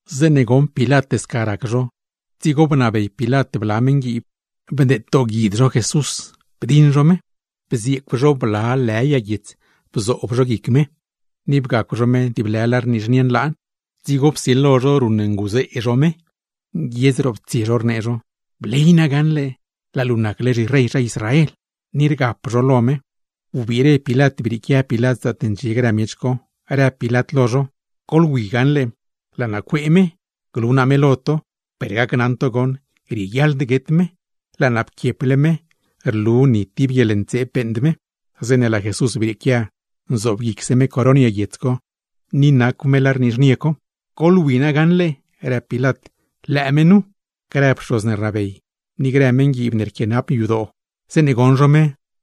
Zeeṉe goṉ Pilat sca rac zho, dzigo bnabey Pilat bla meṉguiib, bdeed dooguid zho Jesús. Bzieecw zho bla lë yag guiets bzoob zho guic me, ni bgacw zho me tib lë lar nizhnie nlaan. Dzigo psilo zho ruṉnguzee zho me, nguiedz roptsie zho rnee zho: ―¡Bley na gaṉle, laa luu nacle zhirey zha Israel! Ni rgap zho lo me. Wbiire Pilat brieequia Pilat zaatne ndxie grë miech co, rëb Pilat lo zho: ―Goḻwi gaṉle laa naa cuee me, glu naa me lo to, per gacnaṉ to gaṉle rieguiaḻd guet me; laa naa pquieple me rlu ni tib guieḻntseeb beeṉd me. Zeeṉe laa Jesús brieequia, nzobguicse me coron yag guiets co, ni nacw me lar nizhnie co. ―Goḻwi na gaṉle ―rëb Pilat―, lëë me nu. Grë pxoz ne rnabey, ni grë meṉguiib ne rquianap yadoo, zeeṉe goṉ zho me,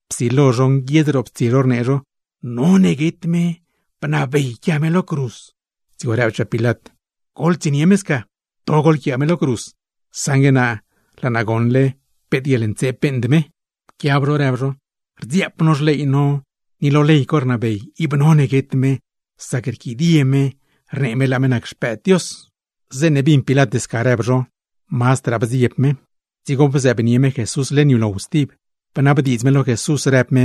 psilo zho nguiedz roptsie zho rnee zho: ―¡None guet me! ¡Bnabey yquia me lo cruz! Dzigo rëbchaa Pilat: ―¡Goḻtsienie me sca! ¡To goḻquiaa me lo cruz! Saṉgue naa, grieelod yquia naa me lo cruz; sac laa naa goṉle peet guieḻntseeb beeṉd me. Pquiab zho rëb zho: ―¡Rdziaap no xley no! Ni ley co rnabey ib none guet me, sac rquidie me rnee me laa me nac Xpëëd Dios. Zeeṉe bin Pilat sca rëb zho, mazdraa bdzieb me. Dzigo bzëëbnie me Jesús leṉ yulow stib, bnabdiidz me lo Jesús, rëb me: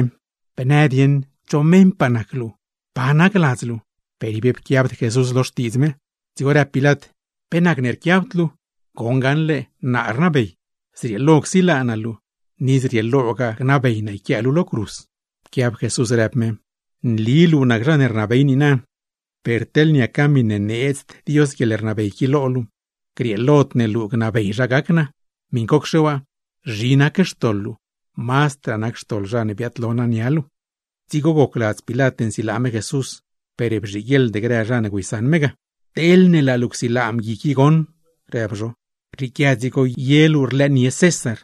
―¿Bnë dieṉ cho meṉpaa nac luu? ¿Pa nac ladz luu? Per ib pquiabd Jesús lo xtiidz Pilat. Dzigo rëb Pilat: ―¿Pe nacne rquiabd luu? ¿Goṉ gaṉle naa rnabey, zrieelo csilaa naa luu, o gnabeygaa naa yquiaa luu lo cruz? Pquiab Jesús, rëb me: ―Nli luu nac zha rnabey niina, per teḻne niaca miṉe needzd Dios guieḻrnabey qui lo luu, grieelod ne luu gnabey zha gac naa. Miṉcocxe waa, zhi nac xtoḻ luu, mazdraa nac xtoḻ zha ne biaadlo naa nia luu. Dzigo gocladz Pilat nsilaa me Jesús, per bzhiguieḻd grë zha ne güeysaṉ me ga. ―Teḻne laa luu csilaa mgui qui goṉ ―rëb zho―, rrieequia dzigo ye luu rlëënie César.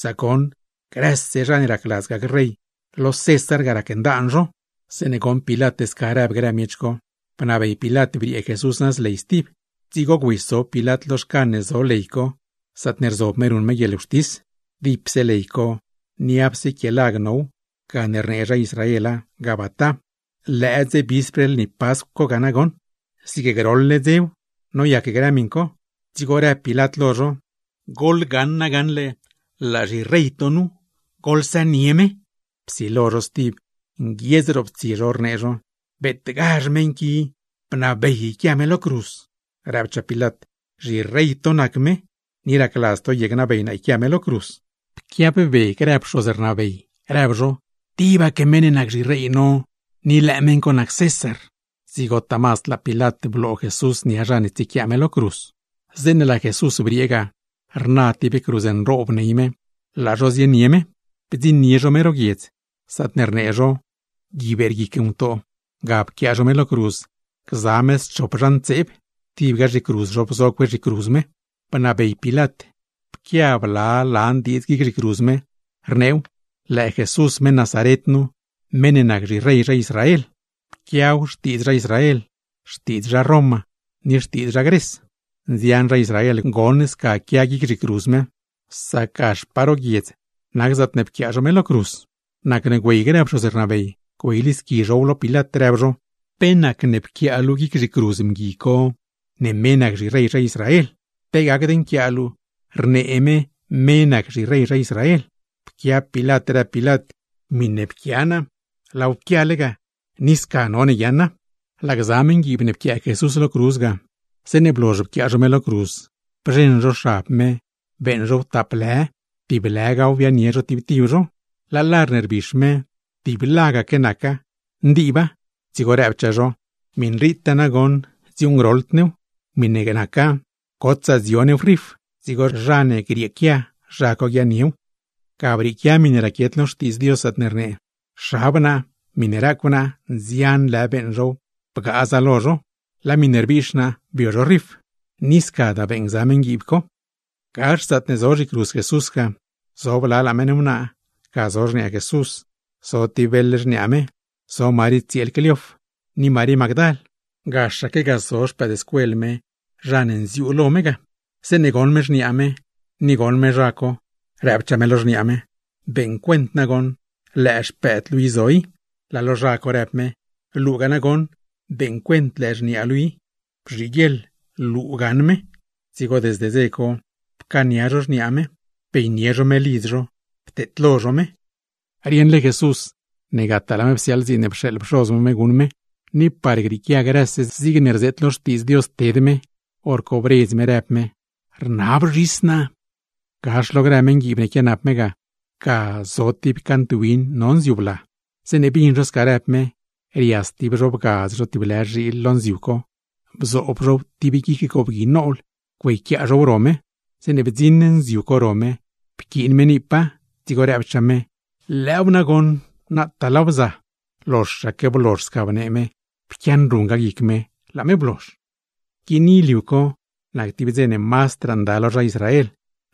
Sac goṉ, grëse zha ne racladz gac rey, lo César ga racndaan zho. Zeeṉe bin Pilat sca rëb grë miech co, bnabey Pilat briee Jesús nëz ley stib. Dzigo güeysob Pilat lo xcan ne zo ley co, zaatne rzob me ruṉ me guieḻwxtis. (Dipse ley co, niapse quie lag now; gane rnee zha Israela Gabata.) Lëë dze vispr lni Pascw co ga nagoṉ, zig groḻle dzew noyac grë miṉ co. Dzigo rëb Pilat lo zho: ―Laa zhirey to nu goṉ. ¡Goḻsënie me! Psilo zho stib, nguiedz roptsie zho, rnee zho: ―¡Beetgazh meṉ qui! ¡Bnabey yquia me lo cruz! Rëbchaa Pilat: ―Zhirey to nac me, ¿ni racladz to ye gnabey naa yquia me lo cruz? Pquiabbe grë pxoz ne rnabey rëb zho: ―¡Tibaque meṉ ne nac zhirey no, ni lëë meṉ co nac César! Dzigotaa mazd laa Pilat bloo Jesús nia zha ne tsiequiaa me lo cruz. Zeeṉe laa Jesús briee ga, rna tib cruz nroob ney me; laa zho zienie me. Bdziṉnie zho me ro guiedz, zaatne rnee zho “Gui Beerguic Ngutoo”; ga pquiaa zho me lo cruz. Ni pquiaa zho schop zha ntseeb, tibga zhicruz zho bzo cue zhicruz me. Bnabey Pilat pquia bla lan diidz guic zhicruz me, rneew: “LËË JESUS MEṈ NAZARET NU, MEṈ NE NAC ZHIREY ZHA ISRAEL.” Pquiaw xtiidz zha Israel, xtiidz zha Roma ni xtiidz zha Gres. Nzian zha Israel goṉ sca quia guic zhicruz me, sac gaxpaa ro guiedz nac zaatne pquiaa zho me lo cruz ga. Nacne güey grë pxoz rnabey, güeylisqui zhow lo Pilat, rëb zho: ―¿Pe nacne pquiaa luu guic zhicruz mgui co, ne me nac zhirey zha Israel? Pe gacd nquiaa luu: “Rnee me, me nac zhirey zha Israel.” Pquiab Pilat rëb Pilat: ―Miṉe pquia naa, laaw pquiale ga. Ni sca none guiaaṉa. Laa grë meṉguiib ne pquiaa Jesús lo cruz ga, zeeṉe blozh pquiaa zho me lo cruz, bzheṉ zho xab me beeṉ zhow tap lë, tib lëgaw biaaṉnie zho tib tib zho. Laa lar ne rbix me, tiblagaque naca, ndiibda; dzigo rëbchaa zho: ―Miṉritaa nagoṉ dziuuṉgroḻd ne. Miṉe naca gotsaa dzio new rif, dzigo zha ne grieequia zha co guiaaṉniew. Ga brieequia miṉe raquiet lo Xtiidz Dios, zaatne rnee: “Xab naa, miṉe racw naa nzian lë beeṉ zhow bgaaza lo zho; laa miṉe rbiix naa, bio zhow rif.” Ni scadaa beeṉ gza meṉguiib co. Gax zaatne zo zhicruz Jesús ga, zo blalaa meṉ wnaa. Ga zo xniaa Jesús, zo tib beḻ xniaa me, zo Marí tsieel Cleof, ni Marí Magdal. Gaxaque ga zo naa. Zeeṉe goṉ Jesús xniaa me, ni goṉ me naa, rëbchaa me lo xniaa me: ―Beeṉ cuent nagoṉ lëë xpëëd luu i zo i. Laa lo naa në me: ―Beeṉ cuent lëë xniaa luu i goṉ. Bzhiguieḻ luu gaṉ me. Dzigo desde dze co, pcaania naa xniaa me bianie naa me lidz naa, pteedlo naa me. Rieṉle Jesús ne gataa laa me psiaaḻ dziin ne pxeeḻ pxoz me me guṉ me, ni par grieequia grëse zigne rzeet lo Xtiidz Dios ted me, hor co bredz me rëb me: ―Rnab zhis naa. Gax lo grë meṉguiib ne quianap me ga, ga zo tib cant win no nziu bla. Zeeṉe bin zho sca rëb me, rias tib zho bgadz zho tib lë zhiil lo nziu co, bzoob zhow guic tib goobgui nool güeyquiaa zhow ro me. Zeeṉe bdziṉ nziu co ro me, pquiin me niipa, dzigo rëbchaa me: ―Lëëw nagoṉ, nataa laaw bza. Zeeṉe blozh sca bnee me, znuse pquianruṉ guic me; laa me blozh. Guini liu co nac tib dze ne mazdraa nda lo zha Israel.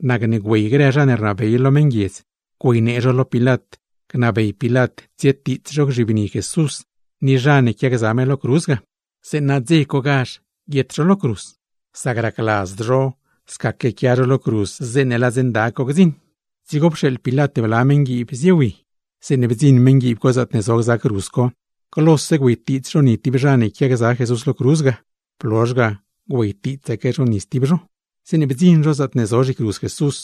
Nacne güey grë zha ne rnabey lo meṉguiedz güeynee zho lo Pilat, gnabey Pilat tsietiits zho gzhibni Jesús ni zha ne pquiagza me lo cruz ga, zeeṉa guietgazh zho lo cruz dze co; sac racladzd zho scaque quia zho lo cruz zeeṉe laa dze nda co gdziṉ. Dzigo pxeeḻ Pilat bla meṉguiib. Zeeṉe bdziṉ zho, glose güeytiits zho ni tib zha ne quiagza Jesús lo cruz ga; blozh ga, güeytiitsaque zho ni stib zho. Zeeṉe bdziṉ zho zaatne zo zhicruz Jesús,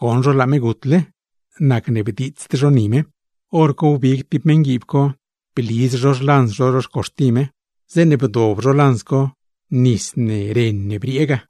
goṉ zho laa me gutle; nacne bdiitsd zho ni me. Horco wbig tib meṉguiib co, bliz zho xlanz zho ro xcuxti me. Zeeṉe bdob zho lanz co, nis ne, ren ne briee ga.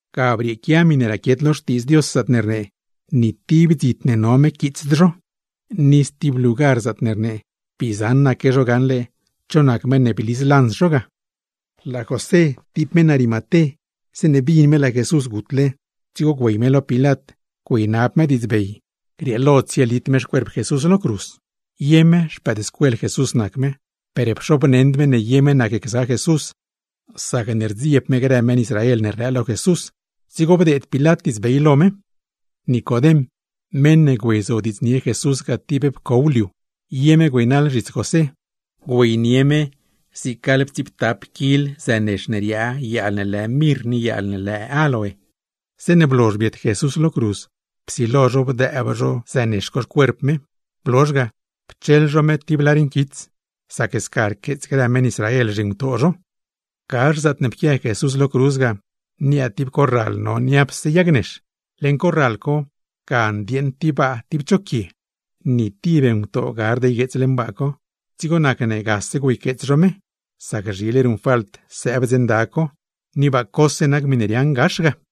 Ga brieequia miṉe raquiet lo Xtiidz Dios, zaatne rnee: “Ni tib dzit ne no me quiitsd zho.” Ni stib lugar, zaatne rnee: “Bii zaṉaque zho gaṉle cho nac meṉ ne bliz lanz zho ga.” Laa José, tib meṉ Arimaté, zeeṉe bin me laa Jesús gutle, dzigo güey me lo Pilat güeynab me diidzbey par grieelo tsielit me xcuerp Jesús lo cruz. Ye me xpëëdscuel Jesús nac me, per pxobneṉd me ne ye me nacgza Jesús; sacne rdzieb me grë meṉ Israel ne rlëë lo Jesús. Dzigo bdeed Pilat diidzbey. Nicodem, meṉ ne güeyzodiidznie Jesús ga tib pcow liu, ye me güeynaḻ zhits José; güeynie me zig gaḻptsiiptap kil tiblo zënex ne riaa yaal ne lë mirr ni yaal ne lë áloe. Zeeṉe blozh biet Jesús lo cruz, psilo zho bdëëb zho zënex co xcuerp me; blozh ga, pcheḻ zho me tib lar nquits; sac sca rqueets grë meṉ Israel zhingutoo zho. Gax zaatne pquia Jesús lo cruz ga, niaa tib corral no niapse yag nex. Leṉ corral co, ga ndieeṉ tib baa tib cho quie, ni tib ngutoo gard ygueets leṉ baa co; dzigo nacne gase güeyqueets zho me, sac zhile ruṉfalt sëëb dze nda co, ni baa cose nac miṉe riaaṉ gax ga.